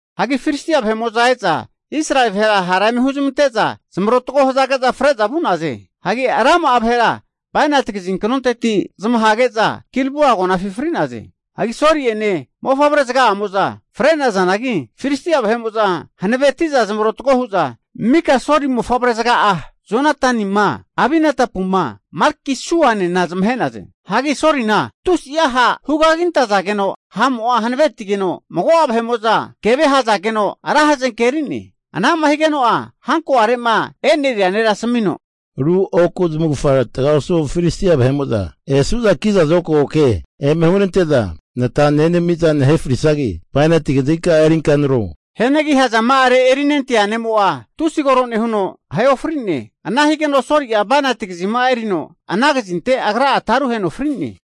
Hagi Filistia vahe'mo'za eza Israeli vahera hara eme huzmante'za zamarotago hazage'za fre'za vu'naze. Hagi rama'a vahera bainati kazinknonteti zamahage'za Gilboa agonafi fri'naze. Hagi Soli'ene mofavrezaga'amo'za fre'nazanagi, Filistia vahe'mo'za hanaveti'za zamarotago hu'za, mika Soli mofavrezaga'a Jonatanima Abinadabuma Malkisuanena zamahe'naze. Hagi Solina tusi'a ha' hugagintazageno ha'mo'a hanavetigeno, mago'a vahe'mo'za kevea ahazageno ra hazenke eri'ne. Ana'ma higeno'a hankoare'ma eneria nera asamino, Ru oku zamavufaga taga osu Filistia vahe'mo'za esu'za kiza zokago ke eme hunante'za nata nenami'za nahe frisagi, bainati kazinka'a erinka nare frio. Hianagi hazama'are erinentea ne'mo'a tusi koro nehuno, ahe ofrine. Ana higeno Soli'a bainati kazima'a erino ana kazinte agra'a taruheno fri'ne.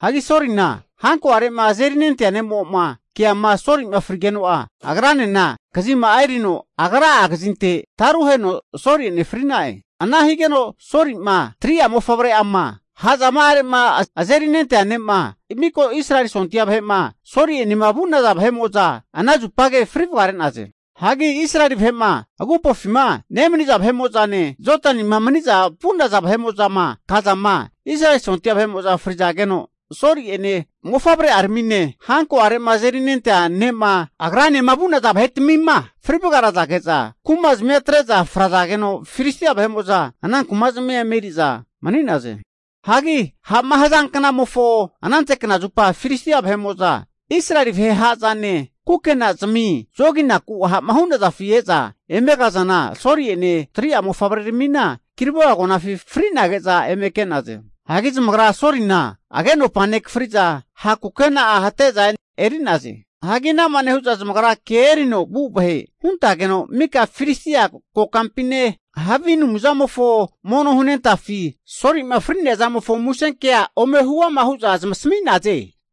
Hagi Solina hankoare'ma azerinentea ne'mo'ma keama Soli'ma frigeno'a, agranena kazima'a erino agra'a kazinte taruheno Soli'ene fri'na'e. Ana higeno Solima, 3'a mofavre'ama, ha'zama'are'ma azerinentea ne'ma, miko Israeli sondia vahe'ma Soli'enema vu'naza vahe'mo'za ana zupage fri vagare'naze. Hagi Israeli vahe'ma agupofima nemani'za vahe'mo'zane, Jodanima mani'za vu'naza vahe'mo'zama kazama, Israeli sondia vahe'mo'za frazageno, Soli'ene maka mofavre'aramine, hanko'are'ma azerinentea ne'ma, agranema vu'naza vahetamima fri vagarazage'za, kumazamia atre'za frazageno, Filistia vahe'mo'za ana kuma'zmia eme eri'za mani'naze. Hagi ha'ma haza knamofo anante knazupa Filistia vahe'mo'za Israeli vahe ha'zane kukenazami zoginaku ha'ma hu'nazafi e'za eme kazana, Soli'ene 3'a mofavre'aramina Gilboa agonafi fri'nage'za eme ke'naze. Hagi zamagra Solina agenopa nekafri'za ha' kukena'a hate'za eri'naze. Hagi anama nehu'za zamagra ke erino vu vahe huntageno mika Filistia kokampine, havi anumzamofo mono hunentafi Soli'ma fri'nea zamofo musenkea ome hu'ama hu'za zmasami'naze.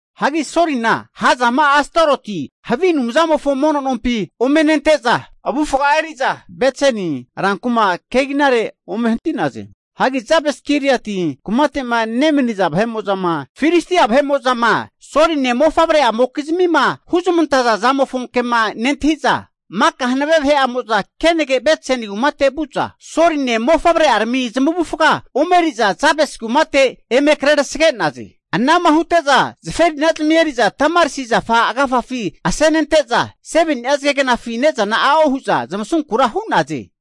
Hagi Solina ha'zama'a Astaroti havi a' anumzamofo mono nompi ome nente'za, avufga'a eri'za Bet-seni rankuma keginare ome hanti'naze. Hagi Jabes-giliati kumate'ma nemaniza vahe'mo'zama, Filistia vahe'mo'zama Soline mofavre'amokizmima huzmantaza zamofo ke'ma nentahi'za, maka hanave vahe'amo'za kenage Bet-seni kumate vu'za, Soline mofavre'arami zamavufaga ome eri'za, Jabesi kumate eme krerasage'naze. Ana'ma hute'za zaferinazami eri'za tamaris zafa agafafi asenente'za, 7ni'a zagegnafi ne'zana a'o hu'za zamasunkura hu'naze.